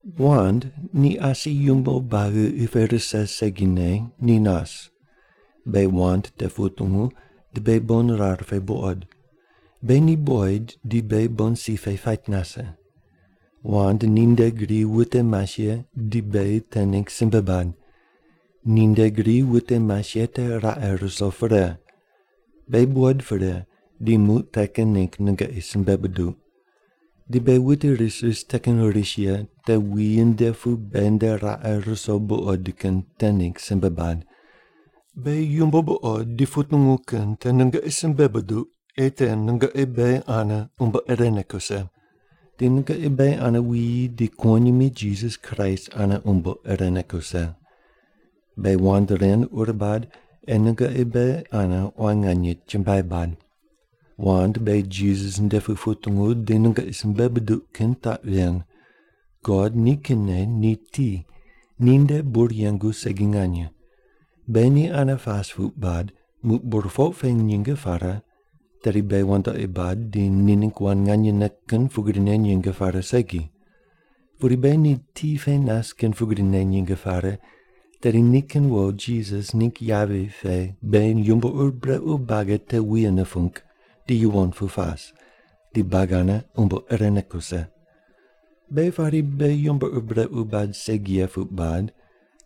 Wand ni asi yumbo buagi qi pe rise segine ni nas. Beghi wand te putungu di beghi bon rar pe buqoid. Beghi ni buqoid, di beghi bon si pe pait nase. Wand ninde gri wute mas ye di beghi te ningg simbe bad. Ninde gri wute mas ye te raqe ruso pre. Beghi buqoid pre, di muq te kin ningg nungoqi simbe buduq. Di beghi wute ris ris te kin ris ye te wuyi nde pu beghi nde raqe ruso buqod kin te ningg simbe bad. Beghi yumbo buqod di putungu kin te nungoqi simbe buduq, ei te nungoqi beghi ane umbo irene kuse. Di nungoqi beghi ane wuyi di kuwonyimi Jisas Kraist ane umbo irene kuse. Beghi wand ren ur bad ei nungoqi beghi ane quan nganye chumbuai bad. Wand beghi Jisas nde pu putungu di nungoqi simbe buduq kin taq ven: God nikinne ni ti, ninde bur yengu segi nganye. Beghi ni ane pas puq bad, muq burpoq pe nyinge pare, tedi beghi wandoqi bad di ni ningg wand nganyene kin pugrine nyinge pare segi. Pudi beghi ni ti pe nas kin pugrine nyinge pare, tedi nikin wo Jisas ningg yavi pe beghi yumbo ur brequ buagi te wuye nupung di yuwon pu pas, di buagi ane umbo irene kuse. Beghi pari beghi yumbo ur brequ bad segi ye puq bad,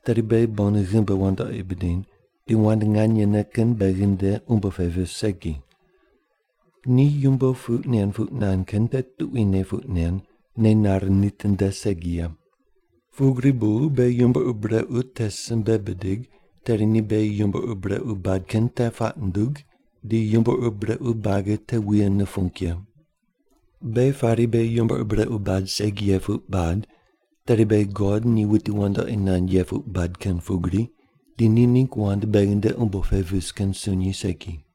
tedi beghi bon ghimbi wandoqi bidiny, di wand nganyene kin beghi nde umbo pe vis segi. Ni yumbo puq nen puq nand kin te tuquine puq nen, nei nare nitinde segi ye. Pugri bu beghi yumbo ur brequ te simbe bidig, tedi ni beghi yumbo ur brequ bad kin te puaq nundug, di yumbo ur brequ buagi te wuye nupung ye. Beghi pari beghi yumbo ur brequ bad segi ye puq bad, tedi beghi God ni wuti wandoqi nand ye puq bad kin pugri, di ni ningg wand beghi nde umbo pe vis kin sunyi segi.